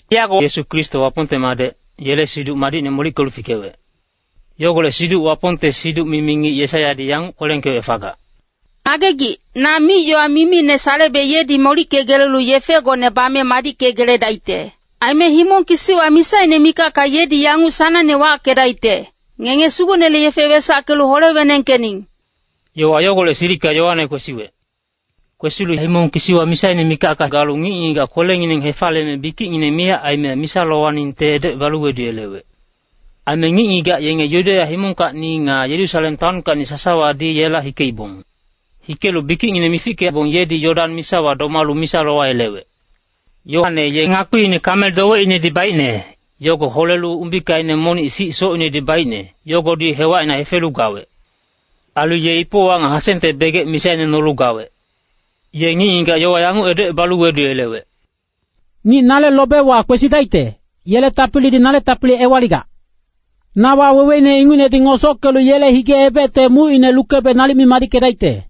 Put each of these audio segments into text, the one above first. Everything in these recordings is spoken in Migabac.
Yago Yesu Kristo Wapongte Madec, yele Siduc Madicne molickelu fikewec. Yogolec siduc Wapongte siduc-mimi ngic Yesaiyadi yanguc kwelengkewec fagac, “Ngagegic, na mic-yowa mimine salebe yedi molickegelelu yefegone bame madickegeledaicte.” “Aime himong kisiwa misaine mikacka yedi yanguc sanangne wackedaicte, ‘Ngenge Sugucnele yefe wesackelu hole-wenengkening.’” Yowa yogolec silicka Yoane kwesiwec. Kwesilu himong kisiwa misaine mikacka galu ngic-ngigac kwelengineng hefaliyeme bikicngineng miyac aime misa lowaningte edocebalu weduyelewec. Aime ngic-ngigac yenge Yudeya himongkacni nga Yerusalem taonkacni sasawadi yela hikeibong. Hikelu bikicngineng mifickebong yedi Yodan misawa domalu misa lowayelewec. Yoane ye ngakpiine kamel dowecinedi baicne, yogo holelu umbikaine monic sic socinedi baicne, yogodi hewacina hefelu gawec. Ailu ye ipowa nga hasengte begec misaine nolu gawec. Ye ngic-ngigac yowa yanguc edocebalu weduyelewec, “Ngic nale lobewa kwesidaicte, yele tapilidi nale tapili ewaligac. Na waweweine ingucnedi ngosockelu yele hige-ebecte mucine lukebe nalic mi madickedaicte.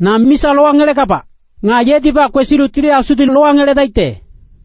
Na misa lowangelegabac. Nga yedibac kwesilu Tili Asudi lowangeledaicte.”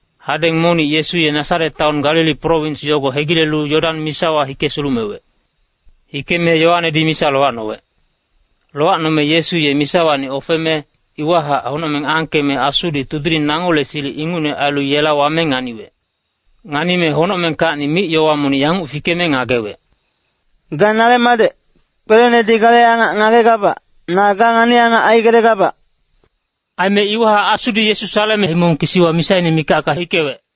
Hadeng monic Yesu ye Nasaret taon Galili prowins yogo hegilelu Yodan misawa hike sulumewec. Hikeme Yoanedi misa lowacnowec. Lowacnome Yesu ye misawacni ofeme, iwahac honocmeng angkeme Asudi tudiling nangole silic ingucne ailu yela wame nganiwec. Nganime honocmengkacni mic-yowa monic yanguc fikeme ngagewec, “Ga nale madec, kwelenedi gale angac ngagegabac, na ga ngani-angac aigelegabac.” Aime iwahac Asudi Yesu saleme himong kisiwa misaine mikacka hikewec.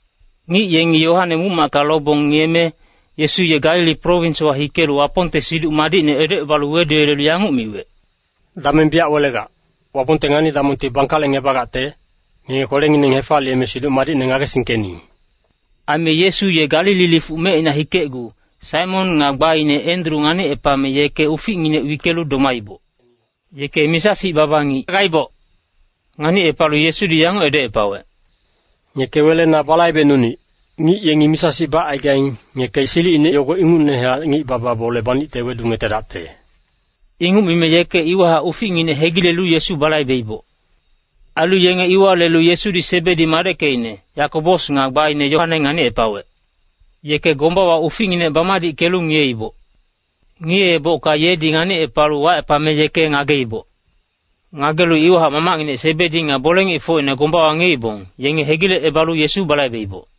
Ngic yengi Yoane muc-macka lobong ngiyeme, Yesu ye Galili prowinswa hikelu Wapongte Siduc Madicne edocebalu weduyelelu yanguc miwec, “Dameng biyac welegac. Wapongte ngani-damongti bangkalecngebagacte, ngenge kwelengineng hefaliyeme Siduc Madicne ngagesingkening.” Aime Yesu ye Galili lifuc mecina hikecgu, Saimon nga gbaine Endru nganicepame yeke uficnginec wickelu domaiboc. Yeke misa-sic baba ngic gaiboc. Nganicepalu Yesudi yanguc edocepawec, “Ngeke wele na balaibecnunic. Ngic yengi misa-sic bacaigaing, ngeke silicine yogo ingucnehac ngic-baba bole banicte wedungetedacte.” Inguc mime yeke iwahac uficnginec hegilelu Yesu balaibeiboc. Ailu yenge iwa lelu Yesudi Sebedi madeckecine, Yakobos nga gbaine Yoane nganicepawec. Yeke gombawa uficnginec bamadickelu ngiyeiboc. Ngiyeebocka yedi nganicepalu wacepame yeke ngageiboc. Ngagelu iwahac mamacnginec Sebedi nga bole-ngicfocine gombawa ngiyeibong, yenge hegilecebalu Yesu balaibeiboc.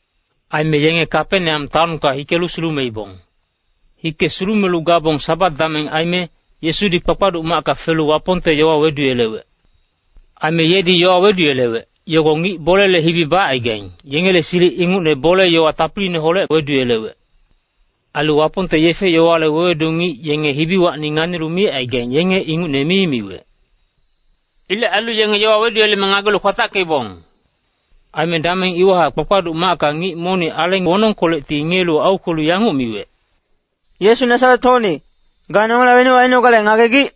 Aime yenge Kapeneam taonka hikelu sulumeibong. Hike sulumelu gabong Sabat dameng aime, Yesudi kpakpaduc macka felu Wapongte yowa weduyelewec. Aime yedi yowa weduyelewec, yogo ngic bolele hibi bacaigaing, yengele silic ingucne bole-yowa tapiliineholec weduyelewec. Ailu Wapongte yefe-yowale wewedu ngic yenge hibiwacni nganilu micaigaing yenge ingucne mi miwec. Ilec ailu yenge yowa weduyeleme ngagelu kwatackeibong. Aime dameng iwahac kpakpaduc macka ngic monic aleng wonongkolecti ngiyelu aukwelu yanguc miwec, “Yesu Nasaret-hocni, ga nongela wenuc ainogale ngagegic?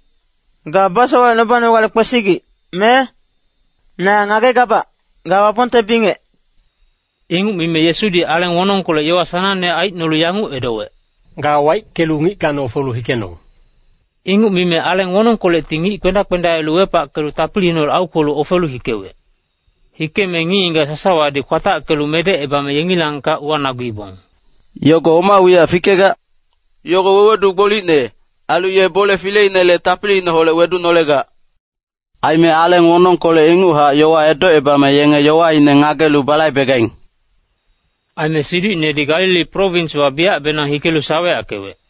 Ga basowalecnubanogale kwesigic, me? Na ngagegabac, ga Wapongte bingec.” Inguc mime Yesudi aleng wonongkolec yowa sanangne aicnolu yanguc edowec, “Ga waickelu ngickacni ofelu hikenong!” Inguc mime aleng wonongkolecti ngic kpenda-kpendaelu wepackelu tapiliineholec aukwelu ofelu hikewec. Hikeme ngic-ngigac sasawadi kwatackelu medecebame yengilangkac uwanaguibong, “Yogo oma wiyac fikegac? Yogo wewedu gbolicne, ailu ye bole fileinele tapiliineholec wedunolegac. Aime aleng wonongkolec inguchac yowa edocebame yenge yowaine ngagelu balaibegaing!” Aime siducinedi Galili prowinswa biyacbenang hikelu saweyackewec.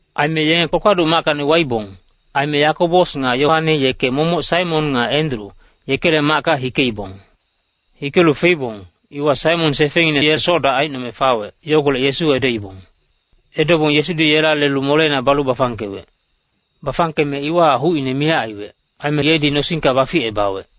Aime yenge kpakpaduc mackacni waibong. Aime Yakobos nga Yoane yeke momoc Saimon nga Endru, yekele macka hikeibong. Hikelu feibong, iwa Saimon sefengngine ye soc-dac aicnome fawec, yogolec Yesu edoibong. Edobong Yesudi yela lelu moleina balu bafangkewec. Bafangkeme iwahac hucine miyac aiwec, aime yedi nosingka baficebawec.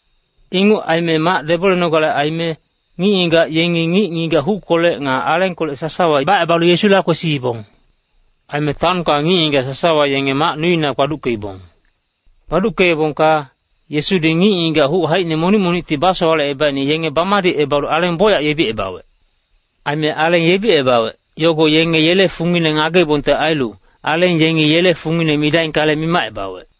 Inguc aime mac debolenogale aime, ngic-ngigac yengi ngic-ngigac huckolec nga alengkolec sasawa bacebalu Yesula kwesiibong. Aime taonka ngic-ngigac sasawa yenge mac nuina kpaduckeibong. Kpaduckeebongka, Yesudi ngic-ngigac huc haicine monic-monicti basowalecebaicne yenge bamadicebalu aleng bocyac yebicebawec. Aime aleng yebicebawec, yogo yenge yele fungine ngageibongte ailu, aleng yengi yele fungine midaingkale, mimacebawec.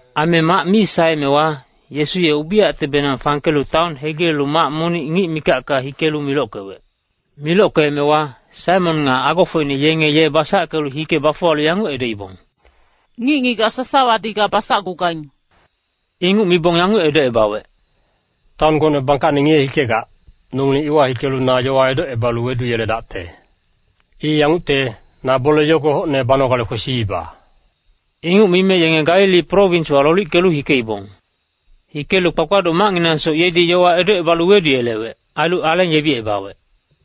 Aime mac mi saeemewa, Yesu ye ubiyactebenang fangkelu taon hegilelu mac monic ngic mikacka hikelu milockewec. Milockeemewa, Saimon nga agofocine yenge ye basackelu hike bafuwalu yanguc edoibong, “Ngic-ngigac sasawadi ga basacgugaing.” Inguc mibong yanguc edocebawec, “Taon gocne bangkacne ngiye-hikegac, nongileng iwa hikelu na yowa edocebalu weduyeledacte. I yangucte, na bole yogo hocne banogale kwesiiba.” Inguc mime yenge Galili prowinswa lolickelu hikeibong. Hikelu kpakpaduc macnginangsoc yedi yowa edocebalu weduyelewec, ailu aleng yebicebawec.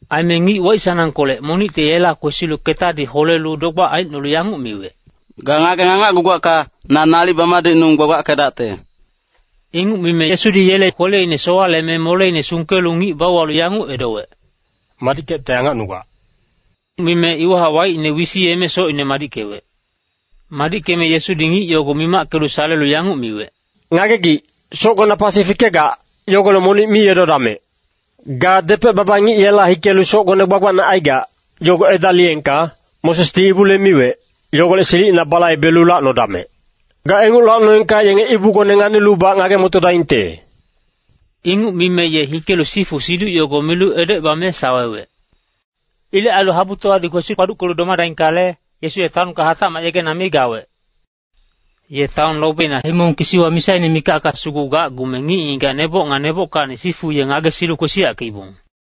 Aime ngic waic-sanangkolec monicti yela kwesilu ketadi holelu dogbac aicnolu yanguc miwec, “Ga ngageng angacgugacka, na nalic bamadicnung gbagbackedacte.” Inguc mime Yesudi yele kweleine sowaleme moleine sungkelu ngic bauwalu yanguc edowec, “Madickecte angacnugac.” Mime iwahac waicine wisiyeme socine madickewec. Madickeme Yesudi ngic yogo mimackelu salelu yanguc miwec, “Ngagegic, socgona pasi fikegac, yogolec monic mi edodamec. Ga depec-baba ngic yela hikelu socgone gbagbacne aigac, yogo edaliyengka, Mosesdi ibule miwec, yogolec silicina balaibelu lacnodamec! Ga inguc lacnoengka yenge ibugone nganilubac ngage-motodaingte.” Inguc mime ye hikelu sifu siduc yogo milu edocebame sawewec. Ilec ailu habutowadi kwesi-kpaduckelu domadaingkale, Yesu ye taonka hatacmac yegena mi gawec. Ye taon lobina himong kisiwa misaine mikacka sugu gacgume ngic-ngigac neboc nga nebockacni sifu ye ngagesilu kwesiyackeibong.